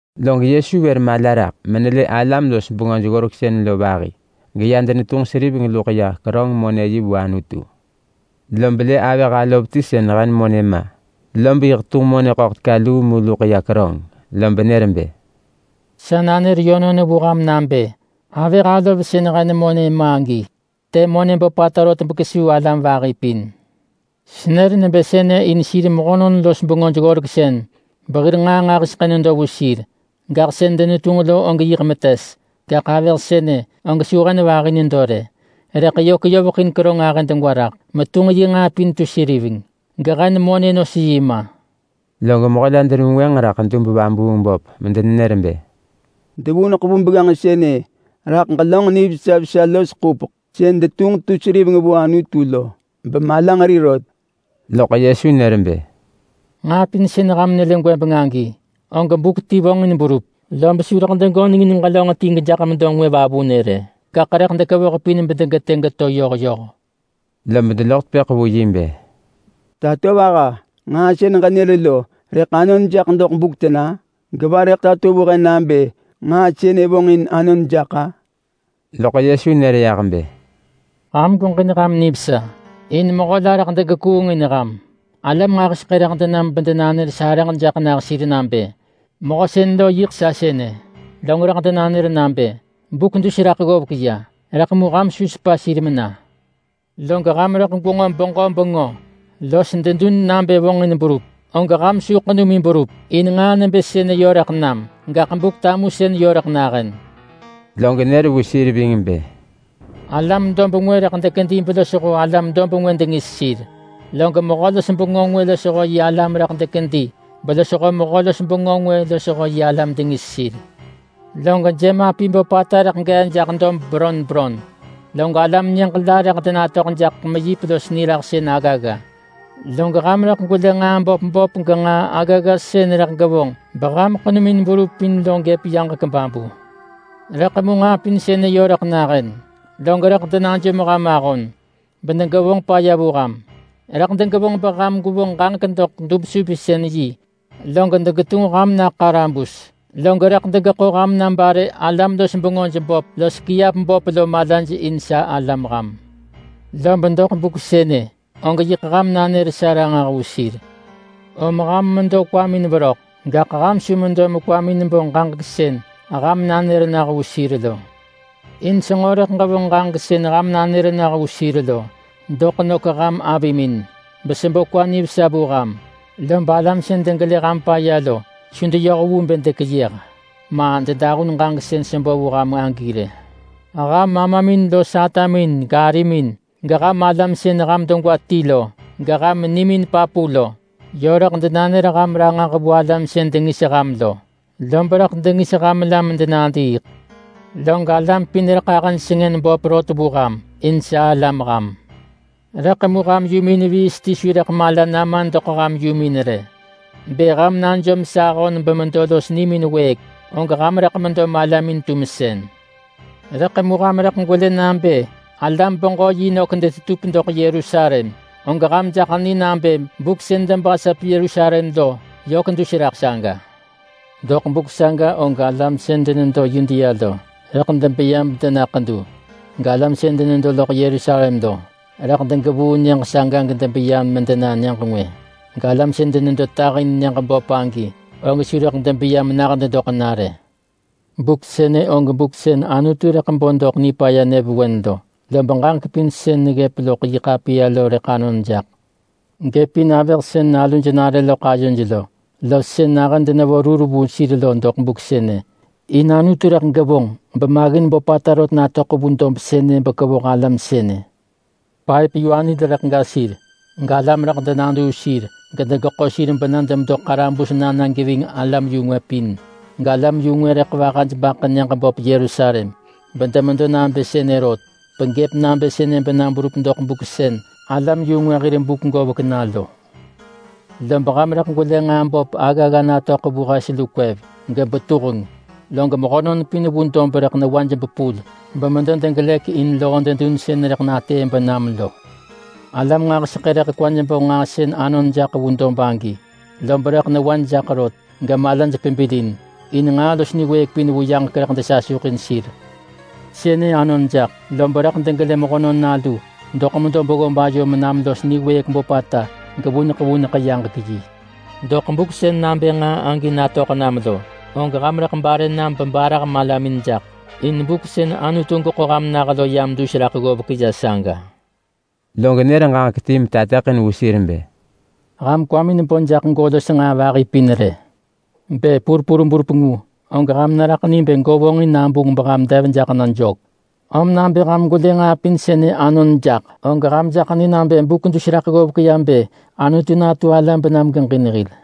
Log Yesu vër mala raḳ menelë alam-los-bengöj-ggoreksën lo vahi, geya denetunġ seriveng luḳ ya keröng-monë-yi vu Anutu. Lob lë avëh alov ti sën hen monë ma, lob yiḳ tunġ monë ḳöḳ teka luu mu luḳ ya keröng. Lob nër bë, “Sa nanër yönon vu ham nabë: Avëh alov sën hen monë ma agi të monë böpata rot bekesuu alam vahi pin. Senër nebë sënë in sir mehönon-los-bengöj-ggoreksën behir nġaa nġahiseḳë nedo vu sir, gaḳ sën denetunġ lo og yiḳ metes. Gaḳ avëh sënë og su hen vahi nedo rë, rëḳ yö keyoveḳin keröng ahë degwa raḳ metunġ yi nġaa pin tu seriveng gehen monë nos yi ma.” Log mehö la denevengwënġ raḳ dub-vabuung-böp medenenër bë, “Devuneḳ vu begganġ sënë raḳ ġelönġ nivesa vesa los ḳupeḳ sën detunġ tu seriveng vu Anutu lo bemalanġeri rot.” Loḳ Yesu nër bë, “Nġaa pin sën ham nelë gwëbeng agi, og buk ti vonġin berup, lob su rëḳ degönengin ġelönġ ti gejaḳ medo ngwë vavunë rë. Gaḳ rëḳ dekevoh pin bedegetë geto yoh yoh.” Lob deloḳ tepëḳ vu yi bë, “Tatovaha, nġaa sën ġenër lo rëḳ anon jaḳ doḳ buk tena? Geva rëḳ tato vu he nabë nġaa sënë vonġin anon jaḳ-a?” Loḳ Yesu nër yah bë, “Ham gweġin ham nivesa, in mehö la rëḳ degekuungin ham. Alam nġahiseḳë rëḳ denam bedenanër sarëġ jaḳ nah sir nabë, ‘Mehö sën lo yiḳ sa sënë.’ Log rëḳ denanër nabë, ‘Buk dus raḳ ggovek ya.’ Rëḳ mu ham su sepa sir mena. Log ham rëḳ gwenġo beġö bengö los dedun nabë vonġin berup, og ham su ḳenumin berup. In nġaa nebë sënë yö rëḳ nam, gaḳ Buk-tamusëneḳ yö rëḳ nahën.” Log nër vu sir ving bë, “Alam dob ngwë rëḳ dekedi belosho alam dob ngwë dengis sir. Log mehö-los-bengö ngwë losho yi alam rëḳ dekedi belosho mehö-los-bengö ngwë losho yi alam dengis sir. Log jemapi böpata rëḳ gee jaḳ dob beron beron. Log alam nyëġ la rëḳ denatöḳ jaḳ meyip los niraḳsën aggagga. Log ham rëḳ gwelë nġaa böp böp genġaa aggagga sën rëḳ gevonġ beham ḳenumin berup in lo gëp yaġek babu. Rëḳ mu nġaa pin sënë yö rëḳ nahën, log rëḳ denajom ham ahon, bedegevonġ paya vu ham. Rëḳ degevonġ beham gwevonġ ġaġek doḳ dub-supinsën-yi log degetunġ ham na ḳarabus. Log rëḳ degeḳo ham na bare alam-los-bengöj böp los kiap böp lo malaj in sa alam ham. Lob doḳ buk sënë, og yiḳ ham nanër sa ranġah vu sir. Om ham medo kwamin veröḳ, gaḳ ham su medo mekwamin bo ġaġek sën ham nanër nah vu sir lo. In senġo rëḳ ġevonġ ġaġek sën ham nanër nah vu sir lo doḳ nök ham avimin, besebo kwa nivesa vu ham. Lob alam sën degelë ham paya lo su deyoh vu bë dekeyëh, ma dedahun ġaġek sën sebo vu ham agi rë. Ham amamin los atamin garimin, geham alam sën ham degwa ti lo, geham nimin papu lo, yö rëḳ denanër ham ranġah vu alam sën dengis ham lo. Lob rëḳ dengis ham la medenadiiḳ. Log alam pin rëḳ ahëj sengën böp rot vu ham, in sa alam ham. Rëḳ mu ham yumin viis ti su rëḳ mala nama doḳ ham yumin rë. Bë ham najom sa ahon bemedo los nimin wëëk, og ham rëḳ medo malamin-tumsën.” “Rëḳ mu ham rëḳ gwelë nabë alam-beġö-yi nök detetup doḳ Yerusalem, og ham jaḳ ni nabë buk sën debasap Yerusalem lo yök dus raḳ saga. Doḳ buk saga og alam sën denedo Yudea lo, rëḳ debeya bedena ḳedu. Galam sën denedo loḳ Yerusalem lo, rëḳ degevuu nyëġ saga gedebeya medena nyëġ ngwë. Galam sën su denedo loḳ nyëġ böp agi rë lo, og su rëḳ debeya menah dedoḳ na rë. Buk sënë og buk sën Anutu rëḳ bo doḳ nipaya nyëvewen lo, lob ġaġek pin sën neggëp loḳ yi ḳapiya lo rëḳ anon jaḳ. Gëpin avëh sën naluj nare loḳ ayoj lo, los sën nahën denevo rur vu sir lo doḳ buk sënë! In Anutu rëḳ gevonġ bemaggin böpata rot natöḳ vu dob sënë bekevoh alam sënë. Paëp-yu-anil rëḳ ga sir. Galam rëḳ denaduu sir gedegeḳo sir bena demedo ḳarabus na na geving alam-yu-ngwë pin. Galam-yu-ngwë rëḳ vahaj baḳë nyëġ böp Yerusalem, bedemedo nabë sënë rot, begëp nabë sënë bena berup doḳ buk sën alam-yu-ngwë hir buk govek na lo. Lob ham rëḳ gwelë genġaa böp aggagga natöḳ vu hes lu kwev, gebetuheng. Log mehönon pin vu dob rëḳ newaj bepul bemedo degelëk in loo dedun sën rëḳ natëë benam lo. Alam nġahiseḳë rëḳ kwaj bo nġaa sën anon jaḳ vu dob agi, lob rëḳ newaj jaḳ rot, gemalaj pebilin. In nġaa los niwëëk pin vu yaġek rëḳ desasuḳin sir. Sënë anon jaḳ, lob rëḳ degelë Mehönon Nalu doḳ medo beggob ayo menam los niwëëk böpata gevuneḳ vuneḳ yaġek yi. Doḳ buk sën nabë nġaa agi natöḳ nam lo, og ham rëḳ bare nam bebarah malamin jaḳ. In buk sën Anutu geḳo ham nah lo yam dus raḳ ggovek ya saga.” Log nër ġaġek ti metateḳin vu sir bë, “Ham kwamin bo jaḳ go los nġaa vahi pin rë. Bë purpur berup ngu, og ham neraḳ ni bë go vonġin nabunġ beham dev jaḳ na jök. Om nabë ham gwelë nġaa pin sënë anon jaḳ, og ham jaḳ ni nabë buk dus raḳ ggovek ya bë Anutu natu ala benam geġin hil.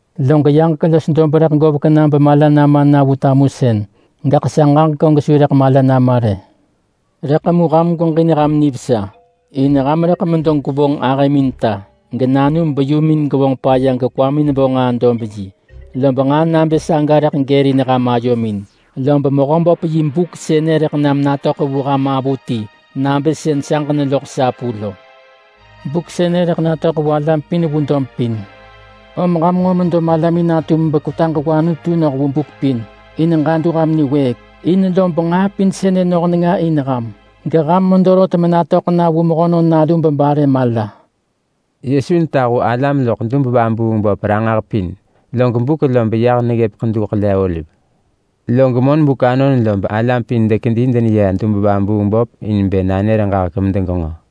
Log yaġek los dob rëḳ govek na bemala nama na vu tamusën, gaḳ sa ġaġek og su rëḳ mala nama rë.” “Rëḳ mu ham gweġin ham nivesa, in ham rëḳ medo gwevonġ ahëmin ta, genanum beyumin gevonġ paya gekwamin bo nġaa-dob-yi, lob nġaa nabë saga rëḳ gërin ham ayomin, lob Mehöböp yi buk sënë rëḳ nam natöḳ vu ham avuti nabë sën saġ neloḳ sapu lo. Buk sënë rëḳ natöḳ vu alam pin vu dob pin. Om ham nġo medo malamin natum bekwetaġ vu Anutu noh vu buk pin in ġadu ham niwëëk. In lob nġaa pin sënë noh nenga in ham, geham medo rot menatöḳ na vu Mehönon Nalu bebare mala.” Yesu netahu alam loḳ dub-vabuung-böp ranġah pin, log buk lob yah neggëp Ḳedu Ḳele-oliv. Log monbuk anon lob alam pin dekedi deneya dub-vabuung-böp in bë nanër ġaġek medegenġo.